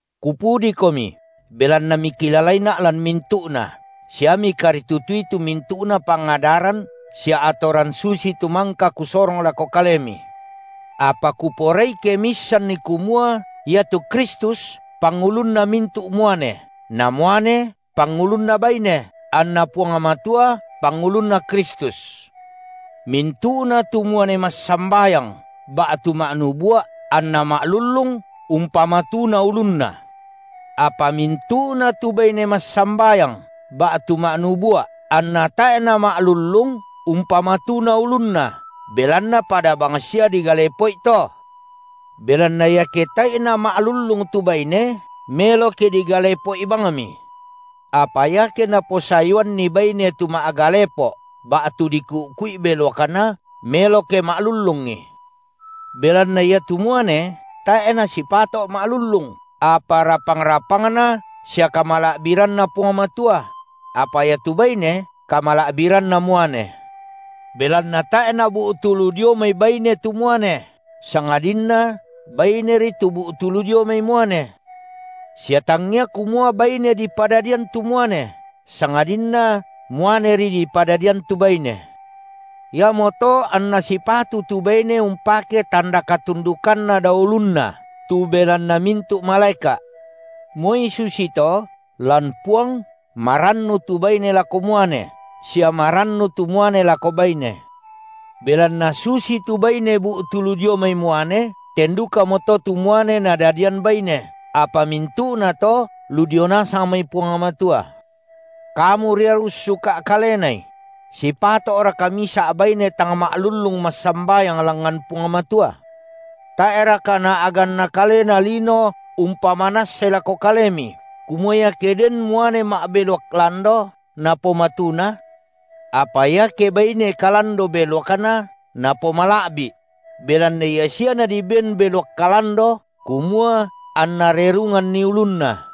Kupudikomi, belanna mikilalaina’ lan mintu’na, sia mikaritutui tu mintu’na pangadaran sia atoran susitu mangka kusorong lako kalemi. Apa kuporai ke miissanni kumua, iatu Kristus pangulunna mintu’ muane, na muane pangulunna baine, anna Puang Matua pangulunNa Kristus. Mintu’na tu muane massambayang ba’tu ma’nubua’ anna ma’lullung, umpamatuna ulunna. Apa mintu’na tu baine massambayang ba’tu ma’nubua’ anna tae’ nama’lullung, umpamatuna ulunna, belanna pada bangsia digalepo’i to. Belanna iake tae’i nama’lullung tu baine, melo ke digalepo’i bangmi. Apa iake naposayuanni baine tu ma’galepo’ ba’tu diku’ku’i beluakna, melo ke ma’lullungi. Belanna iatu muane tae’ nasipato’ ma’lullung, apa rapang-rapangna sia kamala’biranNa Puang Matua; apa iatu baine kamala’biranna muane. Belanna tae’ nabu’tu lu dio mai baine tu muane, sangadinna baineri tu bu’tu lu dio mai muane. Sia tangngia kumua baine dipadadian tu muane, sangadinna muaneri dipadadian tu baine. Iamoto anna sipatu tu baine umpake tanda katundukanna dao ulunna, tu belanna mintu’ malaeka’. Moi susito, lan Puang marannu tu baine lako muane, sia marannu tu muane lako baine. Belanna susitu baine bu’tu lu dio mai muane, ten dukamoto tu muane nadadian baine; apa mintu’na to ludio nasang mai Puang Matua. Kamu ria ussuka’ kalenai: Sipato’raka misa’ baine tang ma’lullung massambayang langngan Puang Matua? Tae’raka naa’ganna kalena lino umpamanassai lako kalemi, kumua iake denni muane ma’beluak lando napomatuna? Apa iake baine kalando beluakna napomala’bi’! Belanna ia sia nadiben beluak kalando kumua anna rerunganni ulunna.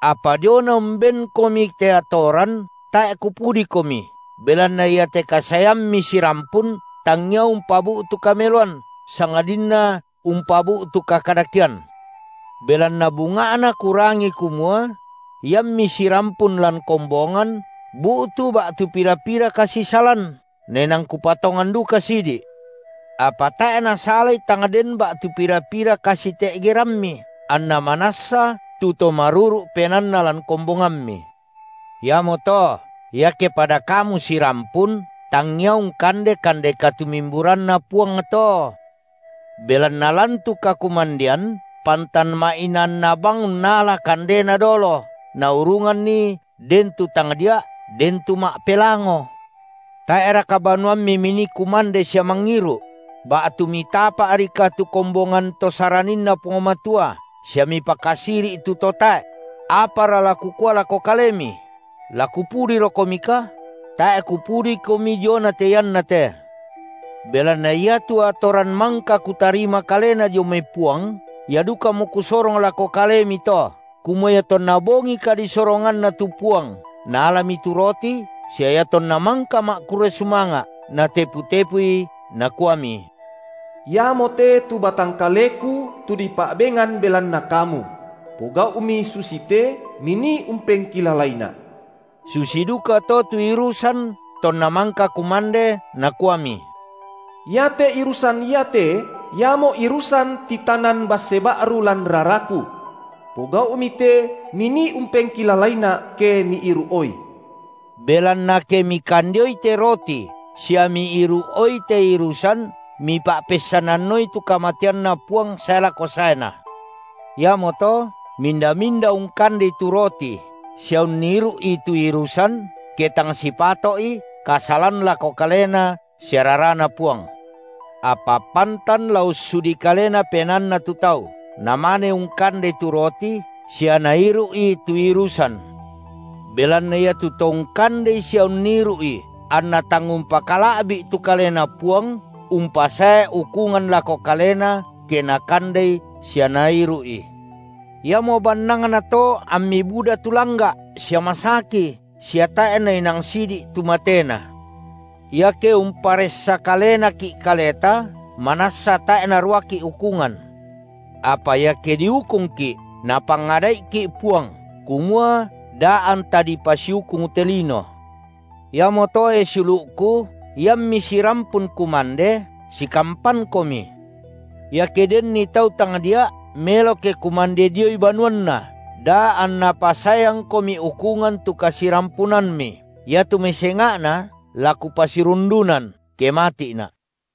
Apa diona umbenkomi te atoran, tae’ kupudikomi, belanna iate kasaeammi sirampun, tangngia umpabu’tu kameloan, sangadinna umpabu’tu kakadakean. Belanna bunga’na kurangi kumua: Iammi sirampun lan kombongan, bu’tu ba’tu pira-pira kasisalan, nainang kupatongan duka sidi’. Apa tae’ nasalai tang den ba’tu pira-pira kasite’gerammi, anna manassa tu to maruru’ penaanna lan kombongammi. Iamoto, iake pada kamu sirampun, tangngia ungkande kande katumimburanNa Puang to. Belanna lan tu kakumandean, pantan ma’inaanna bang unnala kandena dolo, naurunganni den tu tangdia’, den tu ma’pelango. Tae’raka banuammi minii kumande sia mangiru’? Ba’tu mitapa’rika tu kombongan to SaraninNa Puang Matua sia mipakasiri’ tu to tae’? Apara la kukua lako kalemi? La kupudirokomika? Tae’ kupudikomi diona te iannate. Belanna iatu atoran mangka kutarima kalena dio mai Puang, ia dukamo kusorong lako kalemi, to, kumua iatonna bongi kadisoronganNa tu Puang, Naalami tu roti; sia iatonna mangka ma’kurre sumanga’, Natepu-tepui, Nakuami: Iamote tu batang kaleKu, tu dipa’bengan belanna kamu; pogau’mi susite, minii umpengkilalaiNa’. Susi dukato tu irusan tonna mangka kumande, Nakuami: Iate irusan iate iamo irusan titanan basse ba’ru lan raraKu. Pogau’mi te minii umpengkilalaiNa’, ke miiru’oi. Belanna ke mikandeoi te roti sia miiru’ioi te irusan, mipa’peissananoi tu kamateanNa Puang sae lako saeNa. Iamoto minda-minda ungkandei tu roti sia unniru’i tu irusan, ke tang sipato’i, kasalan lako kaleNa sia raraNa Puang. Apa pantan la ussudi kalena penaanna tu tau, namane ungkandei tu roti sia nairu’i tu irusan. Belanna iatu to ungkandei sia unniru’i anna tang umpakala’bi’ tu Kalena Puang, umpasae ukungan lako kalena, ke nakandei sia nairu’i. Iamo bannangnato ammi buda tu langga’ sia masaki, sia tae’ nainang sidi’ tu matena. Iake umparessa kalenaki’ kaleta, manassa tae’ naruaki’ ukungan. Apa iake diukungki’, napangada’iki’ Puang, kumua da anta dipasiukung te lino. Iamoto, e siulu’ku, iammi sirampun kumande, sikampankomi. Iake denni tau tangdia’, melo ke kumande dioi banuanna, da anna pasaeangkomi ukungan tu kasirampunammi. Iatu mai senga’na, la kupasirundunan, ke mati’na’.